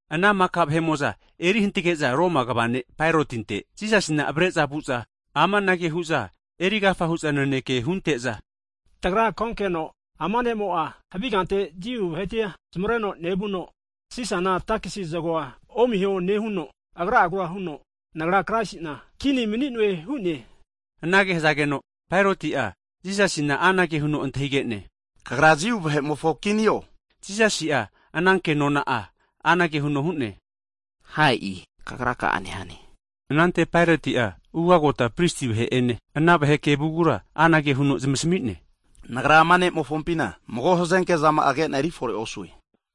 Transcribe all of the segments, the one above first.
Ana maka vahe'mo'za erihantage'za Paerotinte, Jisasina avre'za vu'za, amanage hu'za erigafa hu'za naneke hunte'za, tagra konkeno ama ne'mo'a havi kante Jiu vahetia zmareno nevuno, Sisana takesi zagoa omiho nehuno, Agra'agura huno Nagra Kraisina kini mani'noe hu'ne. Ana hazageno, Paeroti'a Jisasina anage huno antahigene, Kagra Jiu vahe'mofo kinio? Jisasi'a ana kenona'a anage huno hu'ne, Ha e'i kagraka'a nehane. Anante Paeroti'a ugagota pristi vahe'ene, ana vahe kevugura anage huno zmasamine, nagra ama ne'mofompina mago hazenke zama'a kena eri fore osue.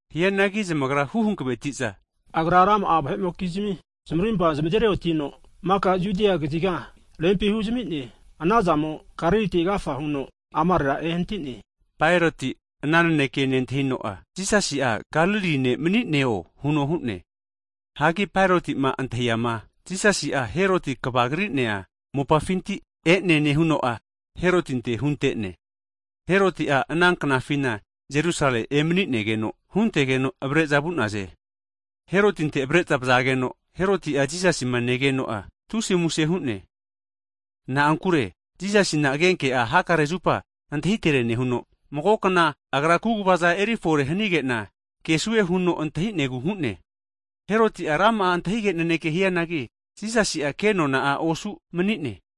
Hianagi zamagra hu hankveti'za, agra rama'a vahe'mokizmi zamarimpa zamazeri otino, maka Judia kaziga rempi huzami'ne. Anazamo'a Galiliti agafa huno amarera ehanati'ne. Paeroti'a ana naneke nentahino, Jisasi'a Galili ne' mani'neo huno hu'ne. Hagi Paerotima antahiama, Jisasi'a Heroti kvagri'nea mopafinti e'ne nehuno'a, Herotinte hunte'ne. Heroti'a ana knafina Jerusalemi emaninegeno huntege'za avare'za vu'naze. Herotinte avare'za vazageno, Heroti'a Jisasima negeno'a tusi muse hu'ne. Na'ankure Jisasina agenke'a hakare zupa antahitere nehuno, magokna Agra kaguvaza eri fore hanigena kesue huno antahinegu hu'ne. Heroti'a rama'a antahige naneke hianagi, Jisasi'a kenona'a osu mani'ne.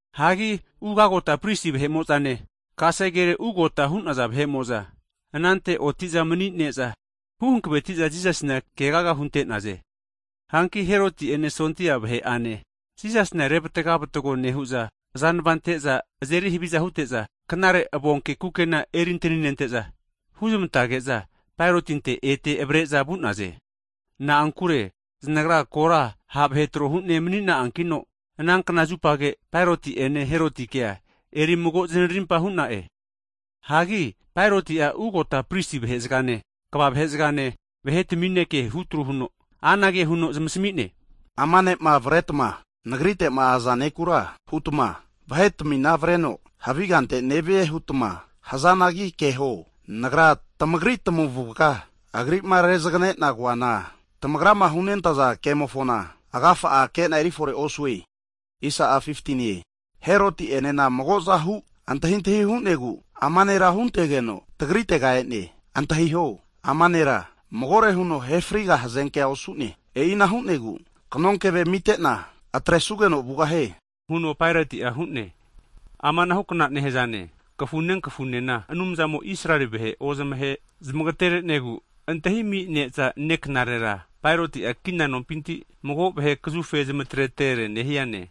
Hagi ugagota pristi vahe'mo'zane, kasegere ugota hu'naza vahe'mo'za, anante oti'za mani'ne'za, hu hankveti'za Jisasina kegaga hunte'naze. Hanki Heroti'ene sondia vahe'ane, Jisasina revatga vatago nehu'za, azanava anteza azeri haviza hute'za, knare avonke kukena eri antaninente'za, huzmantege'za Paerotinte ete avre'za vu'naze. Na'ankure zanagra kora ha' vahe tro hune manina'ankino, ana knazupage, Paeroti'ene Herotikea erimago zanarimpa hu'na'e. Hagi Paeroti'a ugota pristi vahezagane, kva vahezagane, vahetamine kehutru huno, anage huno zamasami'ne, Ama ne'ma avretma nagritema aza nekura hutma, vahetamina avreno havi kante nevie hutma hazanagi keho, nagrama tamagri tamavuga Agri'ma rezaganena koana, tamagrama hunentaza kemofona agafa'a kena erifore osue. Heroti'enena magozahu antahintahi hu'negu, ama nera huntegeno tagritega e'ne. Antahiho, ama nera magore huno ahefriga hazenke osu'ne. E'ina hu'negu, kanonkeve amitena atresugeno vugahie huno Paeroti'a hu'ne. [Amanahukna nehazane, kafune kafunena Anumzamo'ma Israeli vahema ozamahe zamagtere'negu antahimi ne'za neknarera, Paeroti'a kina nompinti mago vahe kazufe zamitere nehiane.]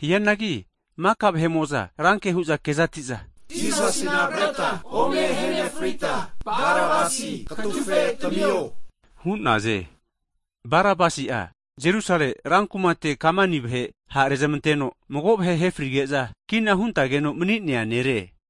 Hianagi maka vahe'mo'za ranke hu'za kezati'za, Jisasina avreta ome ahenefrita, Barabasi katufe tamio! hu'naze. [Barabasi'a, Jerusalemi rankumate kamani vahe ha' renezmanteno, mago vahe ahefrigeza kina huntageno mani'nea nere.]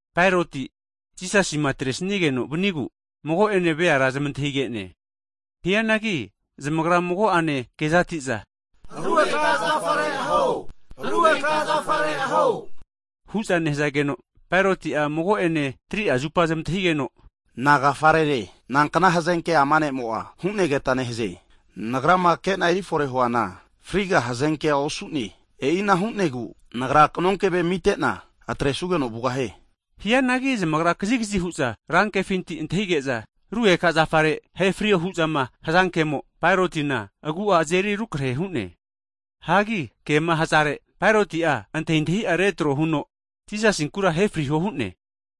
Paeroti Jisasima atresigeno vanigu, mago'ene veara zamantahigene. Hianagi zamagra mago'ane kezatiza, Rugeka zafare aheta hantiho! Rugeka zafare aheta hantiho! Huza nehazageno, Paeroti'a mago'ene 3'a zupa zamantahigeno, Nagafarere? Nankna hazenke ama ne'mo'a hu'negeta nehaze? Nagrama kena eri fore'ma huana, friga hazenke'a osu'ne. E'ina hu'negu nagra kanonkeve amitena atresugeno vugahie. Hianagi zamagra kazigazi hu'za, rankefinti antahige'za, Rugeka zafare ahefrio hu'zama hazankemo, Paerotina agu'a azeri rukrehe hu'ne. Hagi kema hazare, Paeroti'a antahintahi'a retrohuno Jisasinkura ahefriho hu'ne.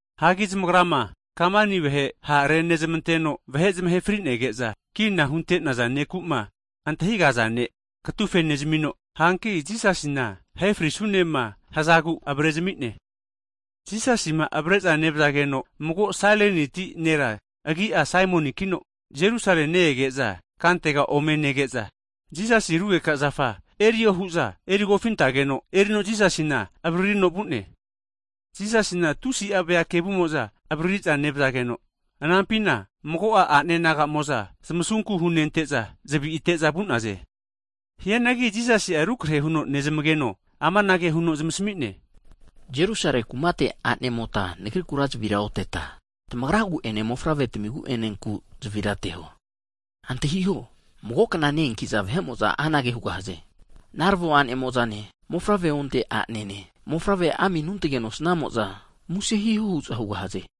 Hagi zamagrama kamani vahe ha' renezmanteno vahe zamahe fri'nege'za kina hunte'naza neku'ma antahigaza ne' katufe nezamino, hanki Jisasina ahefrisunema hazagu avarezami'ne. Jisasima avare'za nevazageno mago Sailiniti (Afrika) nera agi'a Saimonikino, Jerusalemi ne-ege'za kantega ome nege'za, Jisasi rugeka zafa erio hu'za eri kofintageno erino Jisasina avaririno vu'ne. Jisasina tusi'a vea kevumo'za avaririza nevazageno, ananpina mago'a a'nenagamo'za zamasunku hunente'za, zavite'za vu'naze. Hianagi Jisasi'a rukrahe huno nezmageno amanage huno zamasmi'ne, Jerusalemi kumate a'nemota nagrikura zavira oteta, tamagragu'ene mofavretamigu'enenku zavira ateho. Antahiho, mago kna ne-eankiza vahe'mo'za anage hugahaze, narvo a'ne mo'zane, mofavre onte'anene, mofavre ami anuntage nosnamo'za muse hiho hu'za hugahaze.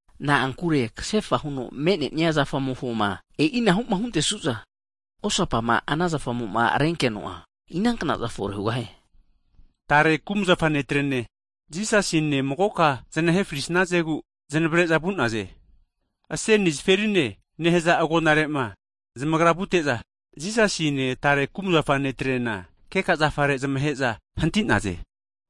Na'ankure kasefa huno me'nenia zafamofoma e'inahuma huntesuza, osapa zafamofona inanknaza fore hugahie? Tare kumzafa netrene, Jisasine magoka zanahe frisazegu zanavre'za vu'naze. Aseni zaferine (Golkote) nehaza agonarema zamagra vute'za, Jisasine tare kumzafa netrena keka zafare zamahe'za hanti'naze.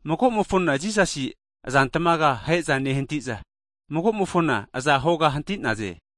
Magomofona Jisasi azantmaga ahe'za nehantiza, magomofona aza hoga hanti'naze.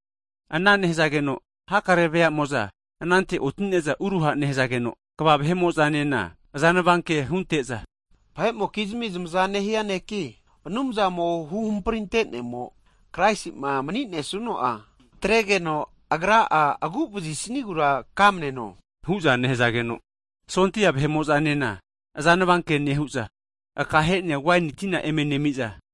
Ana nehazageno, hakare veamo'za anante otine'za uruha nehazageno, kva vahe'mo'zanena azanvanke hunte'za, vahe'mokizmia zamza nehia neki, Anumzamo huhamprintenemo Kraisi'ma mani'nesuno'a atregeno agra'a agu'vazisnigura kamaneno hu'za nehazageno, sondia vahe'mo'zanena azanava ke nehu'za, akahe'nea waini tina eme nemiza,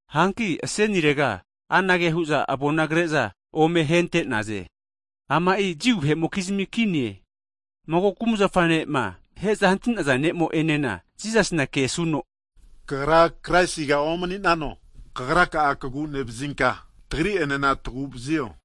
Hanki asenirega anage hu'za avona kreza ome hentenaze, ama'i Jiu vahe'mokizmi kinie. Mago kumzafa ne'ma aheza hantinaza nemo'enena Jisasina kesuno, Kagra Kraisiga omaninano? Kagraka'a kagu'nevazinka, tagri'enena taguvzio!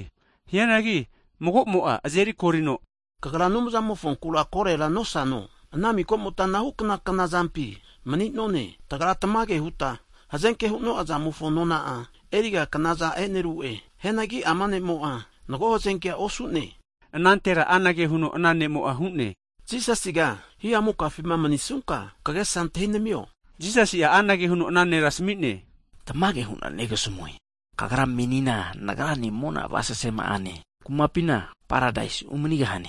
Hianagi mago'mo'a azerikorino, kagra Anumzamofonkura korera nosano? Ana mikomota anahukna knazampi mani'none. Tagra tamage huta hazenke hu'noa zamofo nona'a, eriga knaza eneru'e. Hianagi ama ne'mo'a mago hazenke osu'ne. Anantera anage huno ana ne'mo'a hu'ne, Jisasiga hihamukafima manisunka kagesa antahinamio. Higeno Jisasi'a anage huno ana nera asami'ne, Tamage hu'na negasamue, kagra menina Nagrane mona avasese zama'ane kumapina Paradaisi umanigahane.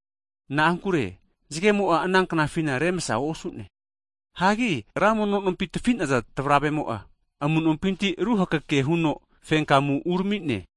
Na'ankure zagemo'a ananknafina remsa osu'ne. Hagi ra mono nompi tafinaza tavravemo'a amu'nompinti ruhakeke huno fenkamu uramine.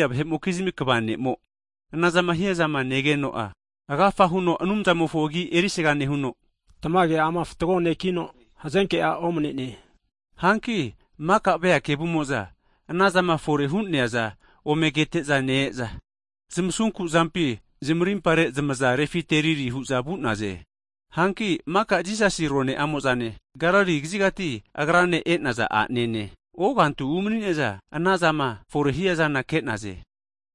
Sondia vahe'mokizmi kva ne'mo'a anazama hiazama negeno'a, agafa huno Anumzamofo agi erisaga nehuno, tamage ama fatgo nekino hazenkea omnene hu'ne. Hanki maka vea kevumo'za anazama fore hu'neaza ome kete'za ne-eza, zamasunku zampi zamarimpare zamaza refiteriri hu'za vu'naze. Hanki maka Jisasi rone'amo'zane, Galili kazigati Agrane e'naza a'nanemo'zane, ogantu umani'ne'za ana zama fore hiazana ke'naze.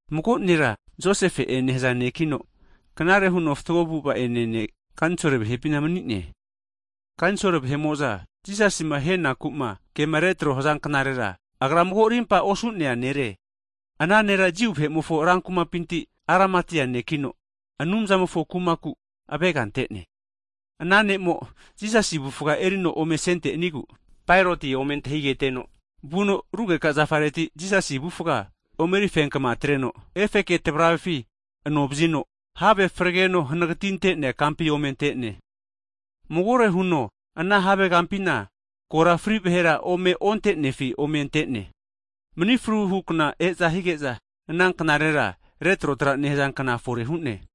Mago nera Josefe'e nehaza nekino knare huno fatgo avu'va ene ne', kanisol vahe'pina mani'ne. Kanisol vahe'mo'za Jisasima ahenakuma kema retroma hazankerera agra mago rimpa osu'nea nere. Ana nera Jiu vahe'mofo rankumapinti Aramatia nekino, Anumzamofo kumaku avega ante'ne. Ana ne'mo'a Jisasi avufga erino ome asentenigu, Paeroti ome antahigeteno, vuno rugeka zafareti Jisasi avufga ome eri fenkma atreno, efeke tavravefi anovazino erino have fregeno hanagatinte'nea kampi ome antene. Magore huno ana havegampina kora fri vahera ome ontenefi ome ante'ne. Mani fruhu kna (Sabat) eza hige'za ana knarera retrotra nehaza kna fore hu'ne.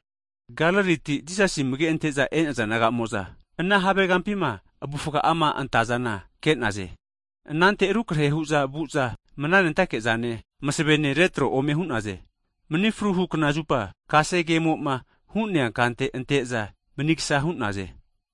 Galiliti Jisasi amagema ante'za e'naza a'nemo'za, ana havegampima avufga'ama antazana ke'naze. Anante rukrahe hu'za vu'za mana nentake'zane, masavene retro ome hu'naze. Mani fruhu kna (Sabat) zupa kasegemoma hu'nea kante anteza manigsa hu'naze.